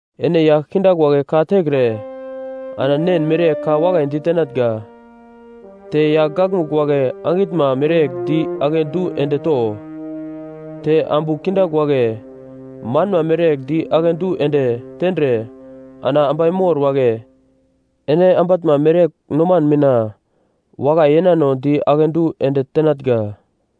Ene yagl kindagl wagle ka tekre ana nen mereyegl ka wakai ditenatnga. Te yagl gakmugl wagle angitnma mereyegl di akedu ende to. Te ambu kindagl wagle manma mereyegl di akedu ende tendre ana ambai mor wagle ene ambatnma mereyegl noman mina wakai yenano di akedu ende tenatnga.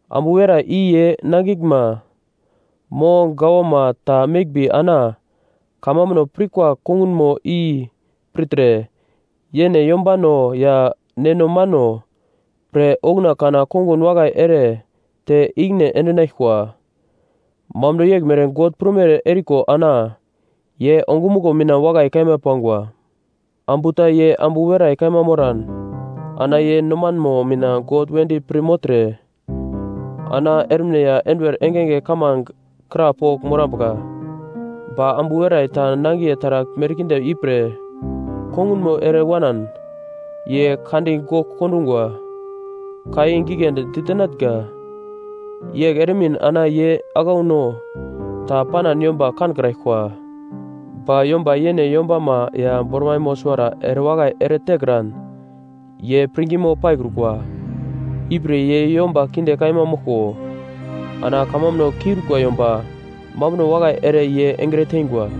Ambu werai i ye nangiglma mo gawama ta meglmbi ana kamambuno pirkwa kongunmo i pirtre, yene yombano ya neno mano pre okuna kana kongun wakai ere te ikine endinaglkwa. Mambuno yeglmere God prumere eriko ana ye ongumuglo mina wakai kaima pangwa. Ambu ta ye ambu werai kaima moran ana ye nomanmo mina God wedi pir mogltre ana ermine ya enduwer engenge kamange krapogl morambuka. Ba ambu werai ta nangiye taragl merkinde ipre kongunmo ere wanan, ye kandi gogl kondungwa. Ka i giglendi ditenatnga, yegl eremin ana ye aglauno ta panan yomba kankraglkwa. Ba yomba yene yombama ya bormaimo suwara erewakai eretekran, ye pirngimo paikrukwa, ipre ye yomba kinde kaima moglko, ana kamambuno kiurikwa yomba mambuno wakai ere ye engre teingwa.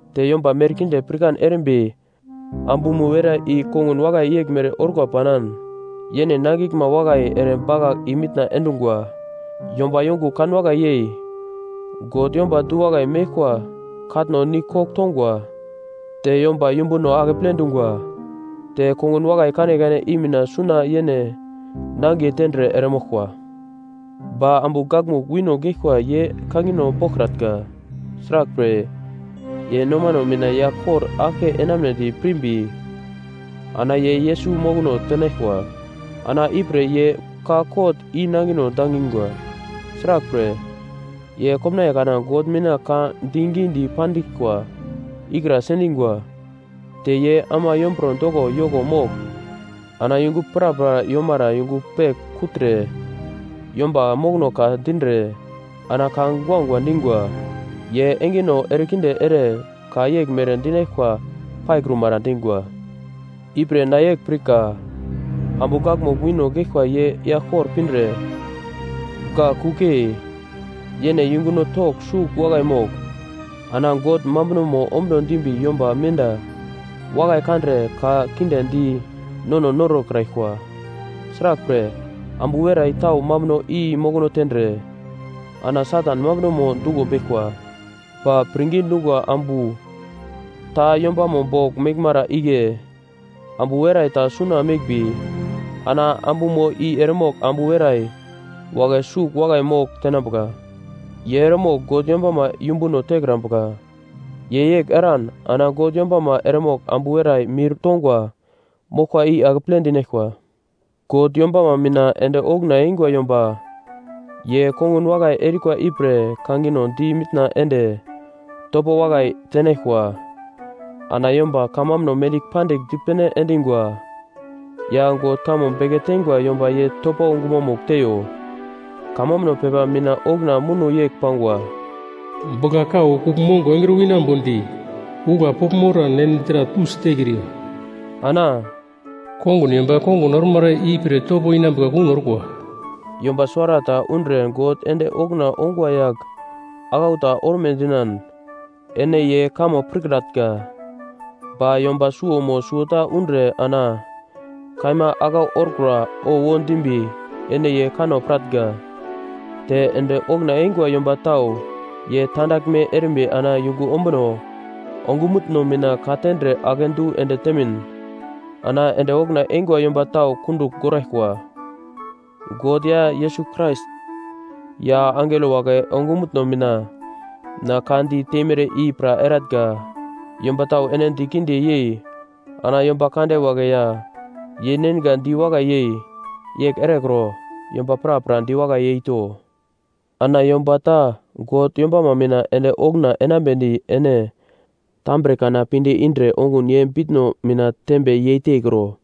Te yomba merkinde pirkan erimbi ambumo werai i kongun wakai yeglmere orkwa panan: Yene nangiglma wakai ere bakagl i-mitna endungwa, yomba yongugl kanwakai yei God yomba du-wakai meglkwa katno nigl kogl tongwa, te yomba yumbuno akeple dungwa, te kongun wakai kanekane i mina suna yene nangiye tendre eremoglkwa. Ba ambu gakmugl wino geglkwa ye kangino boglkratnga. Sraglpre, ye nomano mina yagl kor aglke enamunedi pirimbi ana ye Yesus mokono tenaglkwa, ana ipre ye ka kot i-nangino dangingwa, sraglpre, ye komnaiye kana God mina ka digidi pandiglkwa ikra sendingwa. Te ye ama yomburo doko yoko mogl ana yungu prapra yomara yungu pegl kugltre, yomba mokono ka dindre ana ka guagua dingwa, ye engeno erekinde ere ka yeglmere dinaglkwa paikrumara dingwa. Ipre na yegl pirka, ambu gakmugl wino geglkwa ye yagl kor pindre, gak kuglyei, yene yunguno togl sugl wakai mogl ana God mambunomo ombuno dimbi yomba menda wakai kandre ka kinde di nono norokraglkwa. Sraglpre, ambu werai tau mambuno i mokono tendre ana Satan mambunomo duglo beglkwa. Ba pirngi dungwa ambu ta yombamo bogl meglmara igle ambu werai ta suna meglmbi, ana ambumo i eremogl ambu werai wagle sugl wakai mogl tenambuka. Ye eremogl God yombama yumbuno tekrambuka. Ye yegl eran ana God yombama eremogl ambu werai mir tongwa moglkwa i akeple dinaglkwa. God yombama mina ende okuna eingwa yomba ye kongun wakai erikwa ipre kangino di mitna ende topo wakai tenaglkwa. Ana yomba kamambuno mendigl pandigl dipene endingwa ya God kamo beke teingwa yomba ye topo gumamugl teiyo. Kamambuno pepa mina okuna muno yegl pangwa, “Bugla-kau kugl mongo engre winambodi ugla pogl moran ene dra tusi tekriyo.” Ana “Kongun yomba kongun ormara ipre topo inambuka kuno orkwa.” Yomba suwarata undre God ende okuna ongwa yagl aglau ta orme dinan, ene ye kamo pirkratnga. Ba yomba suwo mo suwota undre ana kaima aglau orkura owo dimbi ene ye kanno piratnga. Te ende okuna eingwa yomba tau ye tandaglme erimbi ana yungu ombuno ongumutno mina ka-tendre akedu ende temin ana ende okuna eingwa yomba tau kundugl goraglkwa. God ya Yesus Krais ya angelo wagle ongumutno mina na ka di teimere i pra eratnga: Yomba tau ene di kinde yei ana yomba kande wagle ya yeinenga di wakai yei, yegl erekro. Yomba prapra diwakai yeito. Ana yomba ta God yombama mina ende okuna enambedi ene tambre kana pinde indre ongun ye bitno mina tembe yeitekro.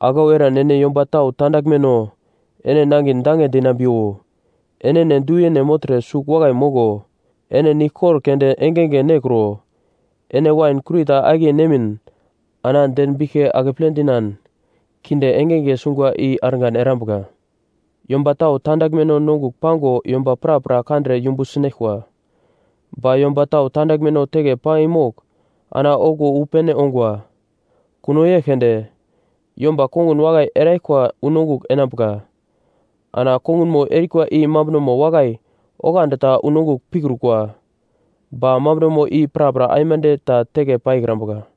Aglau eran yomba tau tandaglmeno ene nangin dange dinambiwo. Enene du-yene mogltre sugl wakai moglo. Ene niglkor keunde engenge nekro. Ene wain kurita akiye nemin ana den biglke akeple dinan kinde engenge sungwa i argan erambuka. Yomba tau tandaglmeno nongugl pango yomba prapra kandre yumbu sinaglkwa. Ba yomba tau tandaglmeno teke paimogl ana okuwo wu pene ongwa. Kuno yegl keunde, yomba kongun wakai eraglkwa unongugl enambuka. Ana kongunmo erikwa i mambunomo wakai oglandi ta unongugl pikrukwa, ba mambunomo i prapra aimande ta teke paikrambuka.